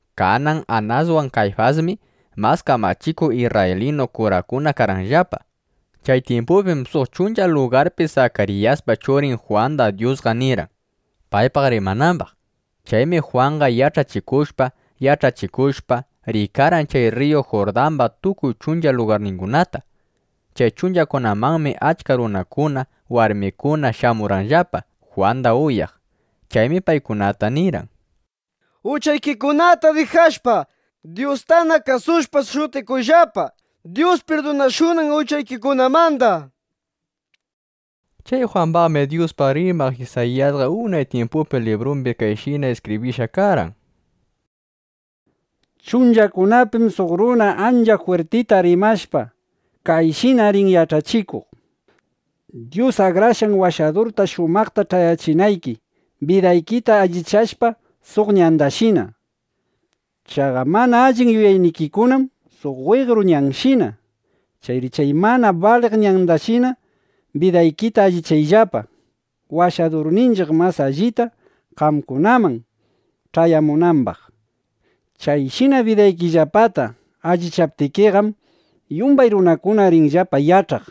Kanan Anaswan Kayfasmi mas kamachikuq isrraylinu kurakuna karqanllapa. Chay tyimpupim suq chuncha lugarpi Sakariyaspa churin Jwanda Dyusqa nirqan, paypaq rimanambaq. Chaymi Jwanqa yach'achikushpa, yach'achikushpa, riykarqan chay rriyu Jurdamba tukuy chuncha lugarningunata. (Chay chunchakunamanmi achka runakuna, warmikuna shamurqanllapa, Jwanda uyaq.) Chaymi paykunata nirqan: —Uchaykikunata dijashpa, Dyustana kasushpa, shutikuyllapa, Dyus pirdunashunan uchaykikunamanda, nishpa. Chay Jwambaqmi Dyuspaq rimaq Isayiyasqa unay tyimpupi librumbi kayshina iskibrishqa karqan: Chunchakunapim suq runa ancha jwirtita rimashpa, kayshina rin yach'achikuq: “Dyus Akrashqan Washadurta shumaqta ch'ayachinayki, bidaykita allichayllapa suq ñandashina. Chaqa mana allin yuyaynikikunam suq weqru ñanshina. Chayri chay mana baliq ñandashina bidaykita allichayllapa, Washadurninchiq mas allita qamkunaman ch'ayamunambaq. Chayshina bidaykillapata allichaptikiqam, yumbay runakuna rinllapa yach'aq: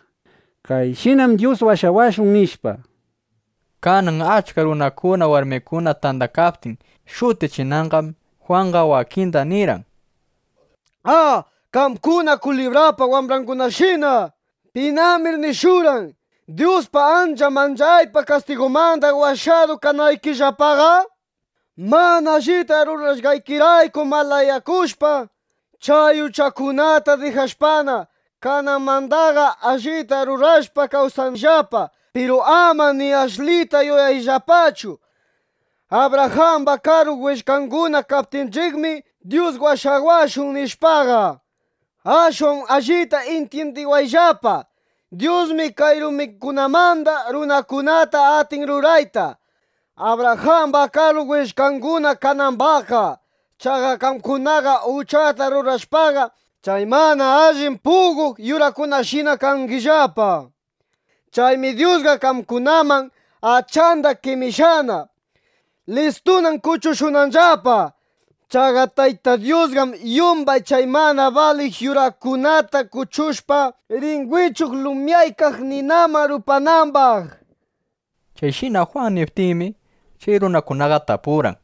Kayshinam Dyus washawashun”, nishpa. Kanan achka runakuna, warmikuna tandakaptin shutichinanqam, Jwanqa wakinda nirqan: —¡A, qamkuna kulibrapa wambrangunata! ¿Pinamir nishurqan, Dyuspa ancha manchaypaq kastigunmanda washadu kanaykillapaqa? Mana allita rurashqaykirayku malayakushpa, chay uchakunata dijashpana, kananmandaqa allita rurashpa, kawsayllapa. Piru ama ni ashlita yuyayllapachu: “Abrajamba karu willkanguna kaptinchiqmi, Dyus washawashun”, nishpaqa. Ashwan allita intyindiwayllapa: Dyusmi kay rumikunamanda runakunata atin rurayta, Abrajamba karu willkanguna kanambaqqa. Chaqa qamkunaqam uchata rurashpaqa, chay mana allin puqoq yurakunashina kangillapa. Chaymi Dyusqa qamkunaman achanda qemishqana. Listunam kuchushunanllapa. Chaqa Tayta Dyusqam yumbay chay mana baliq yurakunata kuchushpa, rin wichuq lumyaykaq ninaman rupanambaq. Chayshina Jwan niptinmi, chay runakunaqa tapurqan: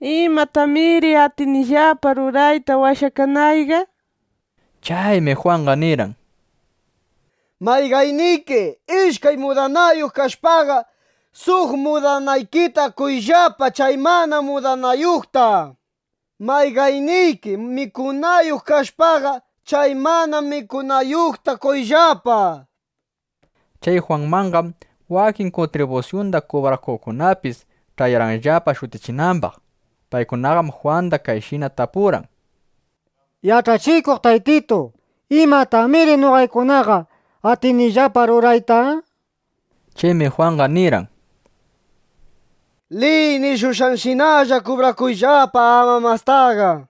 —¿Imatamiri atinillapa rurayta washakanayqa? nishpa. Chaymi Jwanqa nirqan: —Mayqanniki ishkay mudanayuq kashpaqa, suq mudanaykita qoyllapa chay mana mudanayuqta. Mayqanniki mikunayuq kashpaqa, chay mana mikunayuqta qoyllapa, nishpa. Chay Jwanmanqam wakin kuntribusyunda kubrakuqkunapis ch'ayarqanllapa shutichinambaq. Paykunaqam Jwanda kayshina tapurqan: —Yach'achikuq Taytitu, ¿imatamiri noqaykunaqa atinillapa rurayta? nishpa. Chaymi Jwanqa nirqan: —Liy nishushqanshinalla kubrakuyllapa; ama mastaqa, nishpa.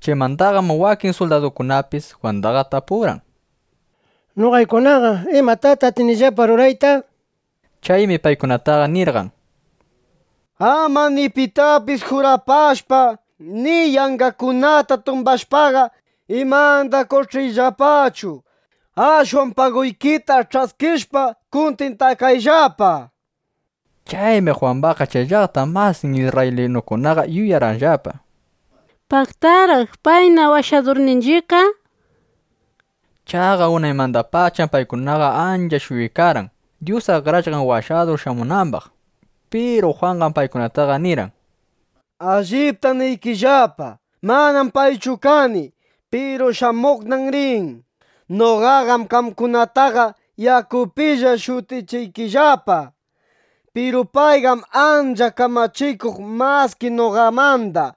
Chaymandaqam wakin suldadukunapis Jwandaqa tapurqan: —Noqaykunaqa ¿imatataq atinillapa rurayta? nishpa. Chaymi paykunata nirqan: —Ama ni pitapis jurapashpa, ni yanqakunata tumbashpaqa, imanda qoch'iyllapachu. Ashwan paguykita ch'askishpa, kuntintakayllapa, nishpa. Chaymi Jwambaqqa chay llaqta masin isrraylinukunaqa yuyarqanllapa: Paqtaraq payna Washadurninchiqqa, nishpa. (Chaqa unaymandapacham paykunaqa ancha shuyaykarqan, Dyus Akrashqan Washadur shamunambaq.) Piru Jwanqam paykunataqa nirqan: —Alliptam niykillapa. (Manam paychu kani.) Piru shamuqnam rin. Noqaqam qamkunataqa yakupilla shutichiykillapa. Piru payqam ancha kamachikuq maski noqamanda.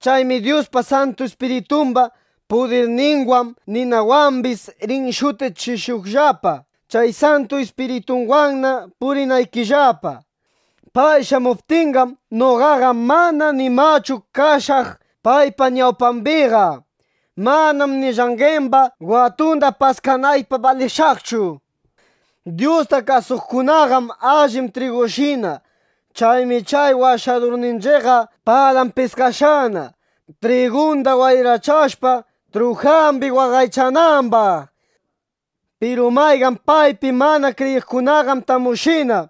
Chaymi Dyuspa Santu Ispiritumba pudirninwan ninawambis rin shutichishuqllapa, chay Santu Ispiritunwanna purinaykillapa. Pay shamuptinqam, noqaqa mana nimachu kashaq paypa ñawpambiqa. Manam ni llanqemba watunda paskanaypaq balishaqchu. Dyusta kasuqkunaqam allin trigushina. Chaymi chay Washadurninchiqqa palan piskashqana, trigunda wayrachashpa, trujambi waqaychanambaq. Piru mayqan paypi mana kriyiqkunaqam tamushina.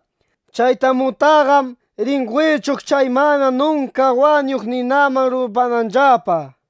Chay tamutaqam rin wichuq chay mana nunka wañuq ninaman rupananllapa, nishpa.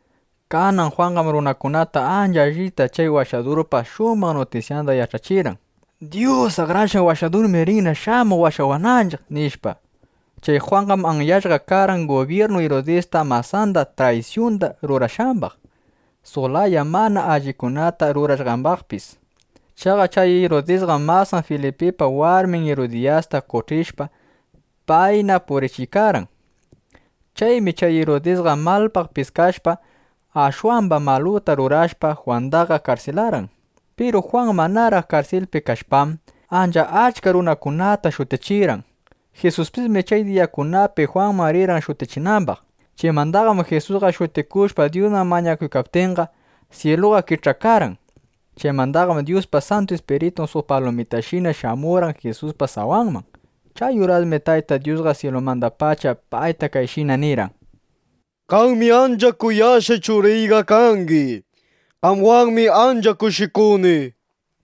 Kanan Jwanqam runakunata ancha allita chay Washadurpa shumaq nutisyanda yach'achirqan: —Dyus Akrashqan Washadurmi rinna shamuq washawananchiq, nishpa. Chay Jwanqam anyashqa karqan gubyirnu Irudista, masanda traysyunda rurashqambaq, suq laya mana allikunata rurashqambaqpis. Chaqa chay Irudisqam masan Filipipa warmin Irudiyasta qoch'ishpa, payna purichiykarqan. Chaymi chay Irudisqa malpaq piskashpa, ashwamba maluta rurashpa, Jwandaqa karsilarqan. Piru Jwan manaraq karsilpi kashpam, ancha achka runakunata shutichirqan. Jisuspismi chay diyakunapi Jwanman rirqan shutichinambaq. Chaymandaqam Jisusqa shutikushpa, Dyusman mañakuykaptinqa, syiluqa kich'akarqan. Chaymandaqam Dyuspa Santu Ispiritun suq palumitashina shamurqan Jisuspa sawanman. Chay urasmi Tayta Dyusqa syilumandapacha payta kayshina nirqan: —¡Qami ancha kuyashqay Churiyqa kangi! ¡Qamwanmi ancha kushikuni! nishpa.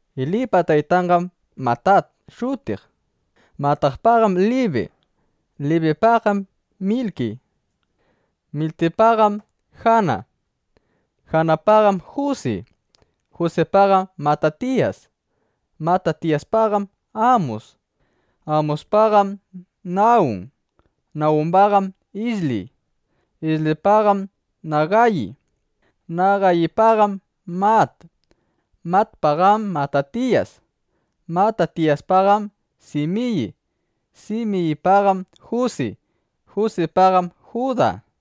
Elipa taytanqam Matat shutiq. Matatpaqam Libi; Libipaqam Milki; Milkipaqam Jana; Janapaqam Jusi; Jusipaqam Matatiyas; Matatiyaspaqam Amus; Amuspaqam Nawun; Nawumbaqam Isli; Islipaqam Nagayi; Nagayipaqam Mat; Matpaqam Matatiyas; Matatiyaspaqam Simiyi; Simiyipaqam Jusi; Jusipaqam Juda;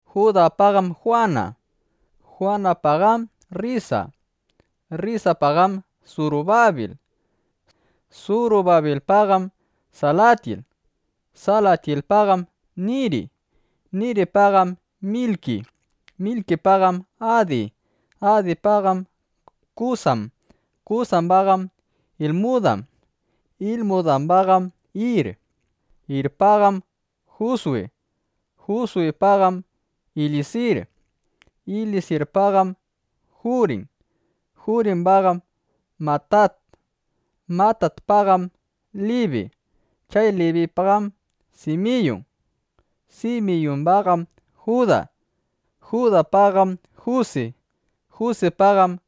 Judapaqam Juwana; Juwanapaqam Rrisa; Rrisapaqam Surubabil; Surubabilpaqam Salatyil; Salatyilpaqam Niri; Niripaqam Milki; Milkipaqam Adi; Adipaqam Kusam; Kusambaqam Ilmudam; Ilmudambaqam Ir; Irpaqam Juswi; Juswipaqam Ilyisir; Ilyisirpaqam Jurin; Jurimbaqam Matat; Matatpaqam Libi; chay Libipaqam Simiyun; Simiyumbaqam Juda; Judapaqam Jusi; Jusipaqam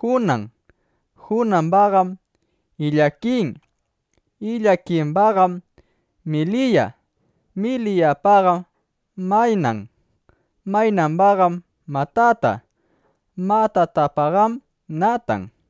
Junan; Junambaqam Ilyakin; Ilyakimbaqam Miliya; Miliyapaqam Maynan; Maynambaqam Matata; Matatapaqam Natan;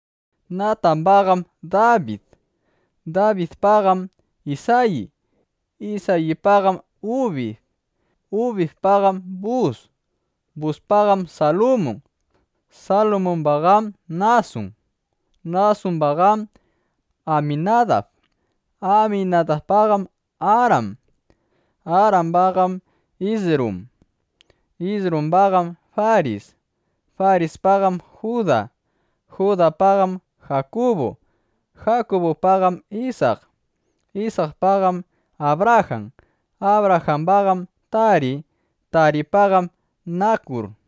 Natambaqam Dabid; Dabidpaqam Isayi; Isayipaqam Ubid; Ubidpaqam Bus; Buspaqam Salmun; Salmumbaqam Nasun; Nasumbaqam Aminadab; Aminadabpaqam Aram; Arambaqam Isrum; Isrumbaqam Faris; Farispaqam Juda; Judapaqam Jakubu; Jakubupaqam Isak; Isakpaqam Abrajan; Abrajambaqam Tari; Taripaqam Nakur;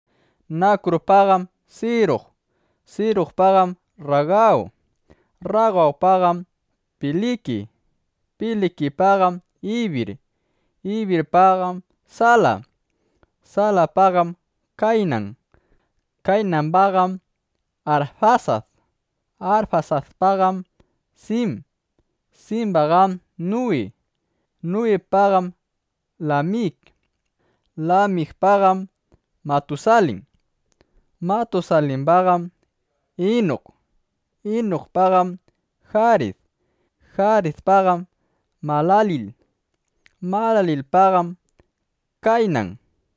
Nakurpaqam Siruq; Siruqpaqam Rragaw; Rragawpaqam Piliki; Pilikipaqam Ibir; Ibirpaqam Sala; Salapaqam Kaynan; Kaynambaqam Arfasad; Arfasadpaqam Sim; Simbaqam Nuwi; Nuwipaqam Lamik; Lamikpaqam Matusalin; Matusalimbaqam Inuk; Inukpaqam Jarid; Jaridpaqam Malalil; Malalilpaqam Kaynan;